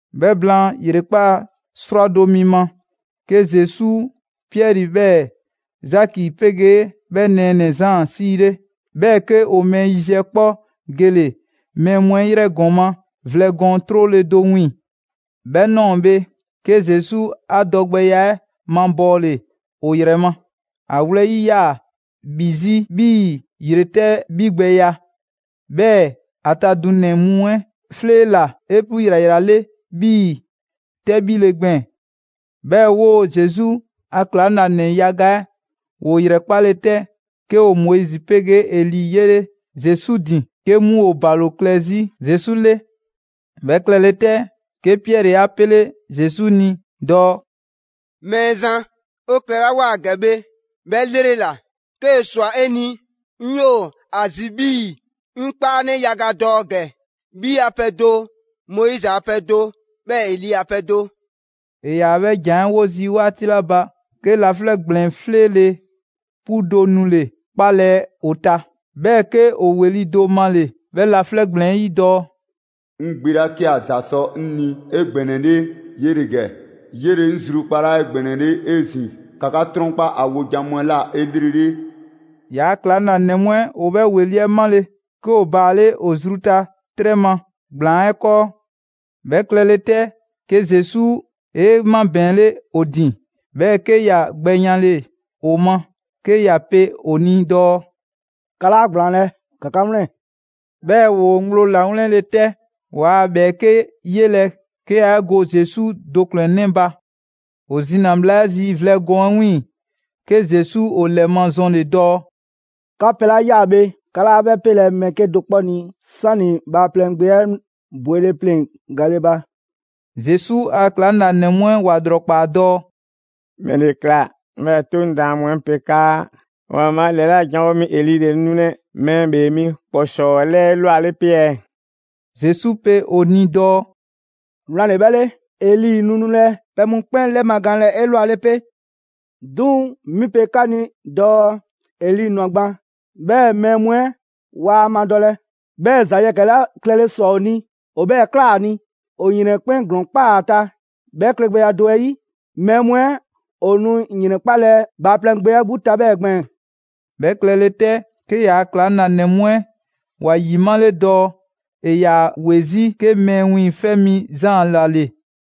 'Bhɛ blaan ‑yrekpaa' 'srwado‑ mi ma, 'ke Zesu Piɛri 'bhɛɛ‑ Zaki 'pegee 'bhɛ nɛɛnɛ‑ Zaan 'siile, 'bhɛɛ‑ 'ke ‑o mɛɛ yiziɛ 'kpɔ gele‑ mɛɛ mu 'ɛ 'yrɛ ‑gɔma' vlɛ gɔɔn 'trole‑ do 'wiiŋ‑. 'Bhɛ ꞊nɔɔ bhe, 'ke Zesu 'a dɔgbɛya 'ɛ mabɔɔle ‑o ‑yrɛ ma: ‑A wlɛyi' 'yaa‑ ‑bhi 'zi 'bhii‑ ‑yretɛ' 'bhigbɛya, 'bhɛɛ‑ ‑a ta dunɛ‑ mu 'ɛ 'fleela‑ 'epu ‑yrayrale 'bhii‑ 'tɛbhile gbɛɛn‑. 'Bhɛɛ‑ 'woo‑ Zesu a ‑klaŋlanɛ yaga 'ɛ ‑woo ‑yrɛkpale 'tɛ, 'ke ‑o Moizi 'pegee Eli 'yele Zesu ‑din, 'ke 'mu ‑o ‑balo klɛ 'zi Zesu 'le. 'Bhɛ klɛle 'tɛ, 'ke Piɛri 'a 'pele Zesu ni dɔɔ: «Mɛɛzan, 'o klɛlawoa ‑gɛ bhe 'bhɛ 'lrela‑. 'Kee‑ ‑swa 'e ni, 'ŋ 'yoo‑ ‑a zi 'bhii‑ 'ŋ 'kpaanɛ yaga dɔ ‑gɛ: 'Bhi a pɛ do, Moizi a pɛ do 'bhɛɛ‑ Eli a pɛ do.» ‑E ‑yaa 'bhɛ ‑jan 'ɛ 'wo zii' 'waati 'la ba, 'ke laflɛ' ‑gblɛn 'fleele‑ 'pu do nule‑ 'kpalɛ‑ ‑o ta, 'bhɛɛ‑ 'ke ‑o ‑weli' do male‑ 'bhɛ laflɛ' ‑gblɛn 'ɛ 'yi dɔɔ: «'Ŋ Gbe 'la 'ke ‑a ‑za sɔ 'ŋ ni 'egbɛnɛle 'yele‑ ‑gɛ, 'yele‑ 'ŋ zrukpalaa 'egbɛnɛle 'ezin‑, ‑ka 'ka 'trɔnkpa ‑a wojan mu 'ɛ ꞊la 'elrele.» ‑Yaa' ‑klaŋlanɛ mu 'ɛ ‑o 'bhɛ ‑weli' 'ɛ 'male‑, 'ke ‑o baale' ‑o zru ta 'trɛ ma ‑gblaan 'ɛ 'kɔɔ. 'Bhɛ klɛle 'tɛ, 'ke Zesu 'e 'mabɛɛnle ‑o ‑din, 'bhɛɛ‑ 'ke ‑ya gbɛ yanle‑ ‑o ma 'ke ‑ya pe ‑o ni dɔɔ: «'Ka 'laa ‑gblaanlɛ', ‑ka 'ka 'wlɛn‑.» 'Bhɛɛ‑ ‑woo ŋgblo ‑lawlɛnle 'tɛ, waa ‑bhɛɛke' 'yelɛ‑ 'ke yaa 'e go Zesu do ‑kplɛnnɛ' ba. ‑O zina bhla 'ɛ zi vlɛ gɔɔn 'ɛ 'wiiŋ‑, 'ke Zesu ‑o ‑lɛmazɔnle‑ dɔɔ: «'Ka pɛ 'la ꞊ya bhe, 'ka 'laa 'bhɛ 'pelɛ‑ mɛɛ 'kedo‑ 'kpɔ ni 'sani‑ Bhaaplɛŋ Gbe 'ɛ bwele pleŋ‑ gale ba.» Zesu a ‑klaŋlanɛ mu 'ɛ ‑wa ‑lrɔkpaa dɔɔ: «‑Mɛle ‑kla 'bhɛɛ‑ 'Toŋ daan mu 'ɛ pe 'kaa ‑Waanbhaa' 'lɛla janwo mi Eli ‑le nu nulɛ Mɛɛ ‑Bhee Mi ‑kpɔsɔɔ 'ɛ 'lɛɛ 'elwale 'pe ɛɛ?» Zesu pe ‑o ni dɔɔ: «Wlan ‑le 'bhɛ 'le, Eli nu nulɛ pɛ mu 'kpɛn 'lɛmagaanlɛ 'elwale 'pe. 'Duŋ‑ 'mi pe 'ka ni dɔɔ Eli ꞊nwa gban, 'bhɛɛ‑ mɛɛ mu 'ɛ waa ‑a madɔlɛ, 'bhɛɛ‑ ‑za yɛkɛ‑ 'la klɛle ꞊swa ‑o ni ‑o 'bhɛɛ‑ ꞊kla ‑a ni. ‑O ‑yrɛn 'ɛ 'kpɛn ‑glɔɔn ‑kpaa ‑a ta. 'Bhɛ klɛgbɛya do 'ɛ 'yi, mɛɛ mu 'ɛ ‑o nu ‑yrɛnkpalɛ Bhaaplɛŋ Gbe 'ɛ 'gbu ta 'bhɛɛ‑ gbɛɛn‑.» 'Bhɛ klɛle 'tɛ, 'ke ‑yaa' ‑klaŋlanɛ mu 'ɛ ‑wa ‑yimale dɔɔ ‑e ‑yaa ‑we 'zi 'ke Mɛɛ Wiiŋfɛ' Mi Zaan ‑la ‑le.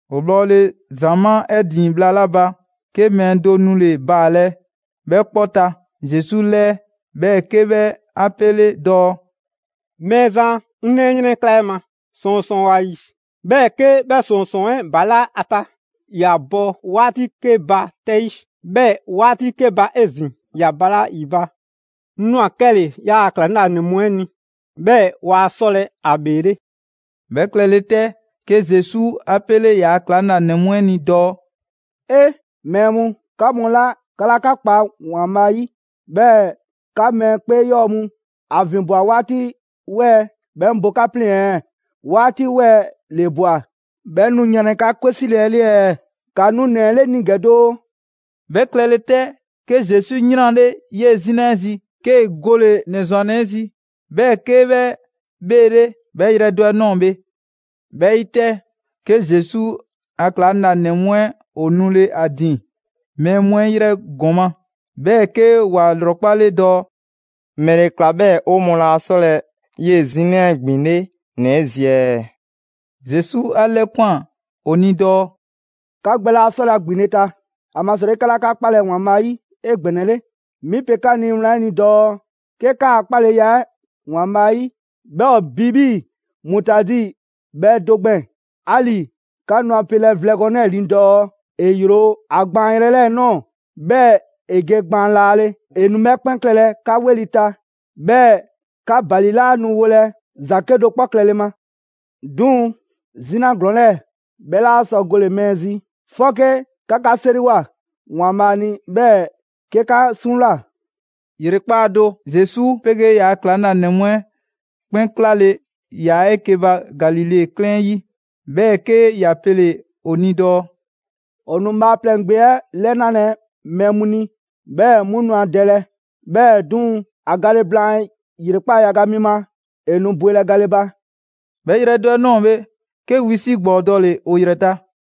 ‑O bhɔle ‑zamaa' 'ɛ ‑din bhla 'la ba, 'ke mɛɛ do nule‑ baalɛ 'bhɛ 'kpɔ ta Zesu 'lɛɛ, 'bhɛɛ‑ 'ke 'bhɛ 'a 'pele dɔɔ: «Mɛɛzan, 'ŋ 'nɛ 'ɛ 'yrɛnkla 'e ma. ‑Sɔɔnsɔɔn ‑o ‑a ‑yi, 'bhɛɛ‑ 'ke 'bhɛ ‑sɔɔnsɔɔn 'ɛ balaa' 'a ta, ‑ya bɔ 'waati 'ke ba 'tɛ 'yi, 'bhɛɛ‑ 'waati 'ke ba 'ezin‑ ‑ya balaa' ‑yi ba. 'Ŋ ꞊nwa 'kɛle‑ 'yaa‑ ‑klaŋlanɛ mu 'ɛ ni, 'bhɛɛ‑ waa 'sɔlɛ‑ ‑a ‑bheele'.» 'Bhɛ klɛle 'tɛ, 'ke Zesu 'a 'pele ‑yaa' ‑klaŋlanɛ mu 'ɛ ni dɔɔ: «'E! Mɛɛ mu, 'ka mu 'la 'ka 'laa 'ka kpa ‑Waanbhaa' 'yi, 'bhɛɛ‑ 'ka mɛɛ 'kpee 'yɔɔ‑ mu. ‑A ‑vinbwa 'waati 'wɛɛ‑ 'bhɛɛ‑ 'ŋ bo 'ka 'pleŋ‑ ɛɛ? 'Waati 'wɛɛ‑ ‑le ꞊bwa, 'bhɛɛ‑ 'ŋ nu yanlɛ 'ka 'kwe 'sile‑ 'ɛ 'le ɛɛ? ‑Ka nu ‑nɛ 'ɛ 'le 'ŋ ni ‑gɛ doo!» 'Bhɛ klɛle 'tɛ, 'ke Zesu 'yranle 'yee‑ 'zina 'ɛ zi, 'kee‑ gole‑ ‑nɛ ‑zwannɛ 'ɛ zi. 'Bhɛɛ‑ 'ke 'bhɛ 'bheele 'bhɛ yrɛ do 'ɛ ꞊nɔɔ bhe. 'Bhɛ 'ɛ 'yi 'tɛ, 'ke Zesu a ‑klaŋlanɛ mu 'ɛ ‑o nule‑ ‑a ‑din mɛɛ mu 'ɛ 'yrɛ ‑gɔma', 'bhɛɛ‑ 'ke ‑wa ‑lrɔkpale dɔɔ: «‑Mɛle ꞊kla 'bhɛɛ‑ 'o mɔɔ laa 'sɔlɛ‑ 'yee‑ 'zina 'ɛ ‑gbinle' ‑nɛ 'ɛ zi ɛɛ?» Zesu 'a 'lɛkwan‑ ‑o ni dɔɔ: «'Ka gbɛ laa 'sɔlɛ‑ ‑a ‑gbinle' ta, ‑amasrɔyi 'ka 'laa 'ka 'kpalɛ‑ ‑Waanbhaa' 'yi 'egbɛnɛle. 'Mi pe 'ka ni wlan 'ɛ ni dɔɔ 'ke 'kaa‑ 'kpaleya 'ɛ ‑Waanbhaa' 'yi, 'bhɛ ‑o bi 'bhii‑ mutaadi bhɛ do gbɛɛn‑, 'ali‑ 'ka nu a pelɛ vlɛ gɔɔn 'lɛɛ‑ ni dɔɔ ‑e ‑yro ‑a gbaanyrɛ 'ɛ 'lɛɛ‑ ꞊nɔɔ, 'bhɛɛ‑ ‑e ge gbaan laale, ‑e nu 'bhɛ 'kpɛn klɛlɛ 'ka 'weli‑ ta. 'Bhɛɛ‑ 'ka ‑bali 'laa nu wolɛ ‑za 'kedo‑ 'kpɔ klɛle ma.» ['Duŋ‑ 'zina ‑glɔɔn 'lɛɛ‑ 'bhɛ 'laa sɔ gole‑ mɛɛ zi, 'fɔke 'ka 'ka 'seriwoa ‑Waanbhaa' ni 'bhɛɛ‑ 'ke 'ka 'suŋwlaa‑.] ‑Yrekpaa' do, Zesu 'pegee ‑yaa' ‑klaŋlanɛ mu 'ɛ 'kpɛn 'klale‑ ‑yaa 'eke‑ ba Galile 'klɛɛn 'ɛ 'yi. 'Bhɛɛ‑ 'ke ‑ya pele‑ ‑o ni dɔɔ: «‑O nu Bhaaplɛŋ Gbe 'ɛ 'lɛnalɛ mɛɛ mu ni, 'bhɛɛ‑ 'mu nu ‑a dɛlɛ, 'bhɛɛ‑ 'duŋ‑, ‑a gale blaan ‑yrekpaa' yaga mi ma, ‑e nu bwelɛ gale ba.» 'Bhɛ yrɛ do 'ɛ ꞊nɔɔ bhe, 'ke wisi' ‑gbɔɔ dɔle‑ ‑o ‑yrɛ ta.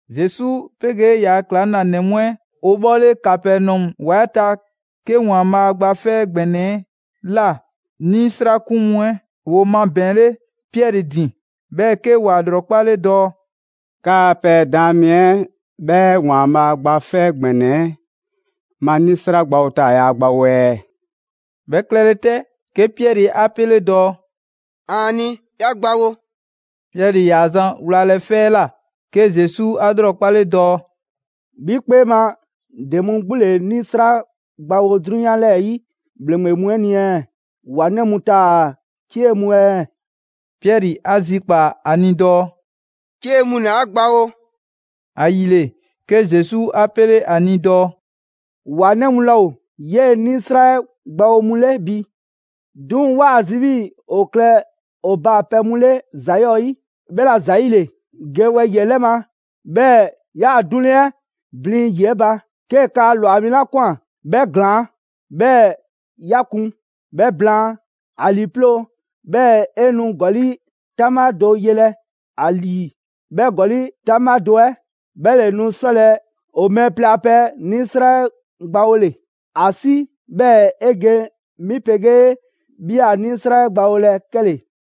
Zesu 'pegee ‑yaa' ‑klaŋlanɛ mu 'ɛ ‑o bhɔle Kapɛnɔmu ‑wa 'ɛ ta, 'ke ‑Waanbhaa' Gba 'Fɛ ‑Gbɛnɛ 'ɛ ꞊la 'nisrakun mu 'ɛ ‑woo mabɛɛnle Piɛri ‑din, 'bhɛɛ‑ 'ke ‑wa 'lrɔkpale dɔɔ: «'Kaa‑ pɛ Daan mi 'ɛ 'bhɛ ‑Waanbhaa' Gba 'Fɛ ‑Gbɛnɛ 'ɛ ma 'nisra 'ɛ gbawo taa‑ yaa ‑a gbawo ɛɛ?» 'Bhɛ klɛle 'tɛ, 'ke Piɛri 'a 'pele dɔɔ: «‑Aani', ‑ya gbawo.» Piɛri ‑yaa zan wlalɛ 'fɛ 'ɛ ꞊la, 'ke Zesu 'a 'lrɔkpale dɔɔ: «'Bhi 'kpee ma ‑de mu 'gbu ‑le 'nisra gbawo 'drunyan 'lɛɛ‑ 'yi ‑bhleŋgbe mu 'ɛ ni ɛɛ? ‑Wa 'nɛ mu taa‑ 'cie mu ɛɛ?» Piɛri 'a zikpaa‑ ‑a ni dɔɔ: «'Cie mu ‑le ‑a gbawo.» ‑Ayile, 'ke Zesu 'a 'pele 'a ni dɔɔ: «‑Wa 'nɛ mu laa ‑o 'yee‑ 'nisra 'ɛ gbawo mu 'le bi. 'Duŋ‑ 'waa ‑a zi 'bhii‑ 'o klɛ ‑o baapɛ mu 'le ‑za 'yɔɔ‑ 'yi. 'Bhɛla‑ ‑zayile, ge wɛyi‑ 'ɛ 'lɛ ma, 'bhɛɛ‑ 'yaa‑ 'duŋleŋ 'ɛ blin ‑yi 'ɛ ba, 'kee‑ kaa ꞊lwa mi 'la ꞊kwan 'bhɛ ‑glaan', 'bhɛɛ‑ 'ya kun. 'Bhɛ blaan, ‑a ‑lii 'ploo‑, 'bhɛɛ‑ 'e nu ‑gɔli' 'taŋbha do yelɛ ‑a ‑lii; 'bhɛ ‑gɔli' 'taŋbha do 'ɛ 'bhɛ ‑le nu 'sɔlɛ‑ 'o mɛɛ plɛ a pɛ 'nisra 'ɛ gbawole. ‑A 'si 'bhɛɛ‑ 'e ge 'mi 'pegee 'bhi a 'nisra 'ɛ gbawolɛ 'kɛle‑.»